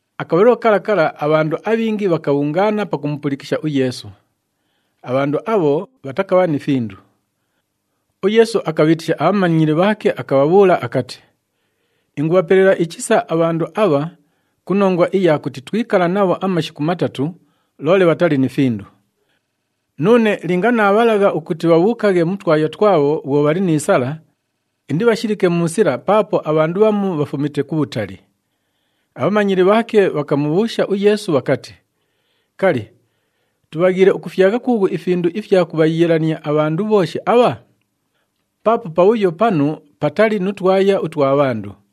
Akabhalilo kala kala, abhandu abhingi bhakabhungaana pakumupulikisha uYeesu. Abhandu abho bhatakabha ni findu. UYeesu akabhiitisha abhamanyili bhaake akabhabhuula akati, “Ingubhapelela ichisa abhandu abha ku nongwa iya kuti twikala nabho amashiku matatu, loole bhatali ni findu. Nuune linga naabhalagha ukuti bhabhuukaghe mu twaya twabho bhwo bhali ni sala, indibhashilike mu sila paapo abhandu bhamu bhafumite kubhutali.” Abhamanyili bhaake bhakamubhuusha uYeesu bhakati, “Kali, tubhaghiile ukufyagha kuughu ifindu ifya kubhayiilania abhandu bhooshi abha? Paapo pabhuyo panu patali nu twaya utwa bhandu.”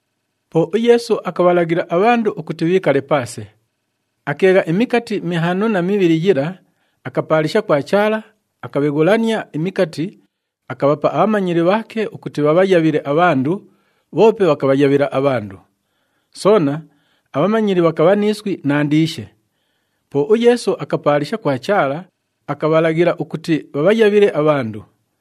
Po uYeesu akabhalaghila abhandu ukuti bhiikale paase. Akeegha imikati mihaano na mibhili yila, akapaalisha kwa Chaala, akabheghulania imikati, akabhapa abhamanyili bhaake ukuti bhabhayabhile abhandu, bhoope bhakabhayabhila abhandu. Soona, abhamanyili bhakabha ni iswi nandiishe. Po uYeesu akapaalisha kwa Chaala, akabhalaghila ukuti bhabhayabhile abhandu.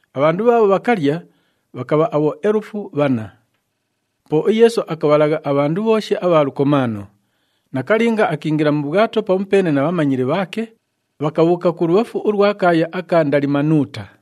Abhandu bhaabho bhakalya, bhakabha abhoelufu bhanna. Po uYeesu akabhalagha abhandu bhooshi abha lukomaano. Nakalinga akiingila mu bhwato pamupeene na bhamanyili bhaake, bhakabhuuka kulubhafu ulwa kaaya aka Ndalimanuuta.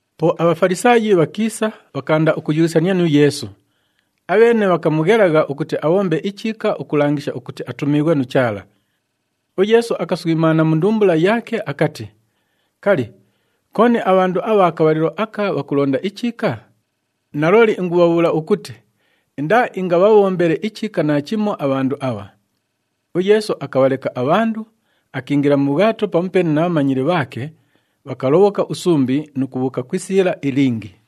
Po aBhafalisaayi bhakiisa, bhakaanda ukuyughisania nu Yeesu. Abheene bhakamughelagha ukuti abhombe ichiika ukulangisha ukuti atumiighwe nu Chaala. UYeesu akaswimaana mu ndumbula yaake akati, “Kali, kooni abhandu abha kabhalilo aka bhakulonda ichiika? Nalooli, ingubhabhuula ukuti indaaingabhabhombele ichiika naachimo abhandu abha.” UYeesu akabhaleka abhandu, akiingila mu bhwato pamupeene na bhamanyili bhaake, bhakalobhoka usumbi nu kubhuuka ku isiila ilingi.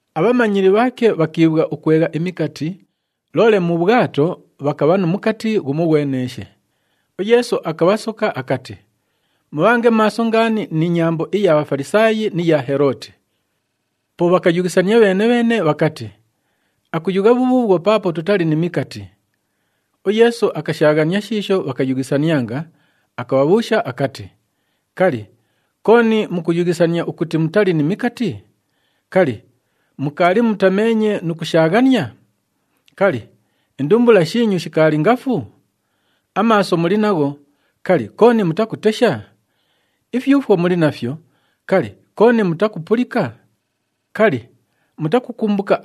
Abhamanyili bhaake bhakiibhwa ukwegha imikati, loole mu bhwato bhakabha nu mukati ghumoghweneeshe. UYeesu akabhasoka akati, “Mubhange maaso ngaani ni nyambo iya Bhafalisaayi ni ya Helooti.” Po bhakayughisania bheene-bheene bhakati, “Akuyugha bhubhuubhwo paapo tutali ni mikati.” UYeesu akashaaghania shiisho bhakayughisanianga, akabhabhuusha akati, “Kali, kooni mukuyughisania ukuti mutali ni mikati? Kali, mukaali mutameenye nu kushaaghania? Kali, indumbula shiinyu shikaali ngafu? Amaaso muli nagho, kali, kooni mutakutesha? Ifyufwo muli nafyo, kali, kooni mutakupulika? Kali, mutakukumbuka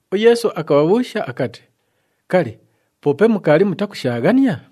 UYeesu akabhabhuusha akati, “Kali, poope mukaali mutakushaaghania?”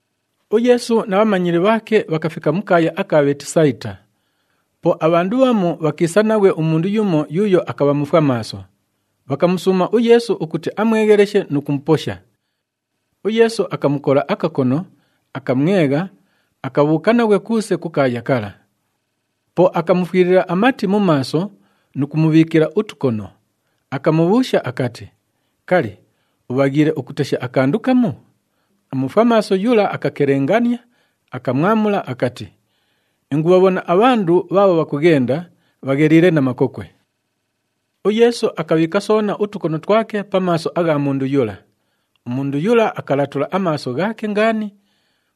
UYeesu na bhamanyili bhaake bhakafika mu kaaya aka Bheetisayita. Po abhandu bhamu bhakiisa naghwe umundu yumo yuuyo akabha mufwamaaso, bhakamusuuma uYeesu ukuti amwegheleshe nu kumuposha. UYeesu akamukola akakono, akamwegha, akabhuuka naghwe kuuse ku kaaya kala. Po akamufwilila amati mu maaso nu kumubhiikila utukono, akamubhuusha akati, “Kali, ubhaghiile ukutesha akandu kamu?” Umufwamaaso yula akakelengania, akamwamula akati, “Ingubhabhona abhandu bhaabho bhakughenda, bhagheliile na makokwe.” UYeesu akabhiika soona utukono twake pa maaso agha mundu yula. Umundu yula akalatula amaaso ghaake ngaani,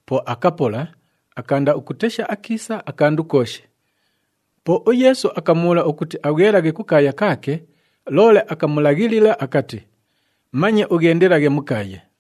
po akapola, akaanda ukutesha akiisa akandu kooshi. Po uYeesu akamubhuula ukuti abhwelaghe kukaaya kaake, loole akamulaghilila akati, “Manye ughendelaghe mu kaaya.”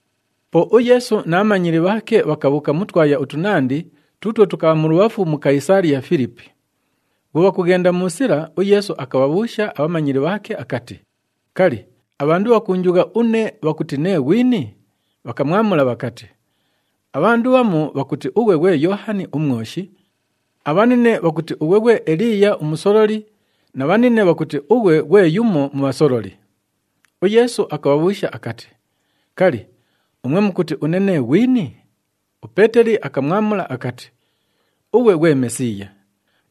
Po uYeesu na bhamanyili bhaake bhakabhuuka mu twaya utunandi tuutwo tukabha mulubhafu mu Kayisaaliya-Filipi. Bhwo bhakughenda mu sila, uYeesu akabhabhuusha abhamanyili bhaake akati, “Kali, abhandu bhakuunjugha une bhakuti nee ghwini?” Bhakamwamula bhakati, “Abhandu bhamu bhakuti ughwe ghwe Yoohani uMwoshi, abhanine bhakuti ughwe ghwe Eliiya umusololi na bhanine bhakuti ughwe ghwe yumo mu bhasololi.” UYeesu akabhabhuusha akati, “Kali, umwe mukuti une nee ghwini?” UPeeteli akamwamula akati, “Ughwe ghwe Mesiiya.”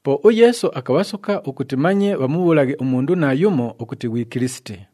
Po uYeesu akabhasoka ukuti manye bhamubhuulaghe umundu naayumo ukuti ghwi Kilisiti.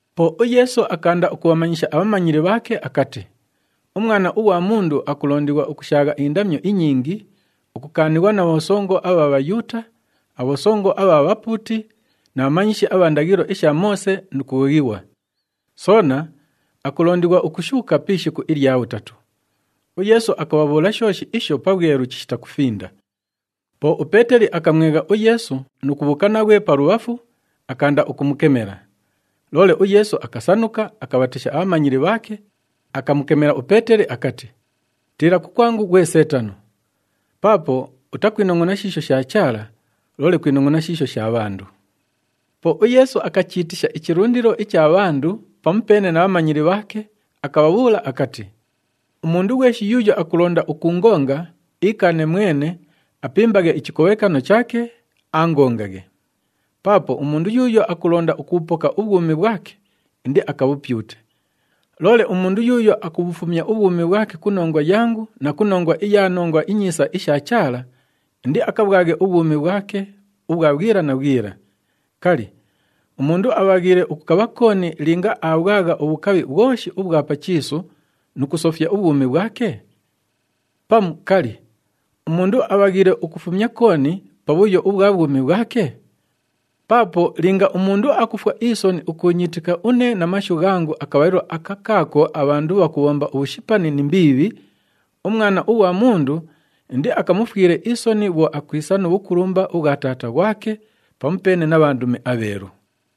Po uYeesu akaanda ukubhamanyisha abhamanyili bhaake akati, “UMwana ughwa Mundu akulondighwa ukushaagha indamyo inyingi, ukukaanighwa na bhosongo abha Bhayuuta, abhosongo abha bhapuuti na bhamanyishi abha ndaghilo isha Moose nu kughoghighwa. Soona akulondighwa ukushuuka pi ishiku ilya bhutatu.” UYeesu akabhabhuula shooshi isho pabhwelu chishita kufinda. Po uPeeteli akamwegha uYeesu nu kubhuuka naghwe palubhafu, akaanda ukumukemela. Loole uYeesu akasanuka, akabhatesha abhamanyili bhaake, akamukemela uPeeteli akati, “Tiila kukwangu ghwe Seetano! Paapo utakwinongʼona shiisho sha Chaala, loole kwinongʼona shiisho sha bhandu.” Po uYeesu akachiitisha ichilundilo icha bhandu pamupeene na bhamanyili bhaake, akabhabhuula akati, “Umundu ghweshi yuuyo akulonda ukuungonga, iikaane mwene, apimbaghe ichikobhekano chaake, aangongaghe. Paapo umundu yuuyo akulonda ukubhupoka ubhwumi bhwake, indiakabhupyute. Loole umundu yuuyo akubhufumya ubhwumi bhwake ku nongwa yangu na ku nongwa iya Nongwa iNyiisa isha Chaala, indiakabhwaghe ubhwumi bhwake ubhwa bhwila na bhwila. Kali, umundu abhaghiile ukukabha kooni linga aabhwagha ubhukabhi bhwoshi ubhwa pa chiisu nu kusofya ubhwumi bhwake? Pamu, kali, umundu abhaghiile ukufumya kooni pa bhuyo ubhwa bhwumi bhwake? Paapo linga umundu akufwa isoni ukuunyiitika une na mashu ghangu akabhalilo aka kaako abhandu bhakubhomba ubhushipani ni mbiibhi, uMwana ughwa Mundu indiakamufwile isoni bhwo akwisa nu bhukulumba ubhwa Taata ghwake pamupeene na bhandumi abheelu.”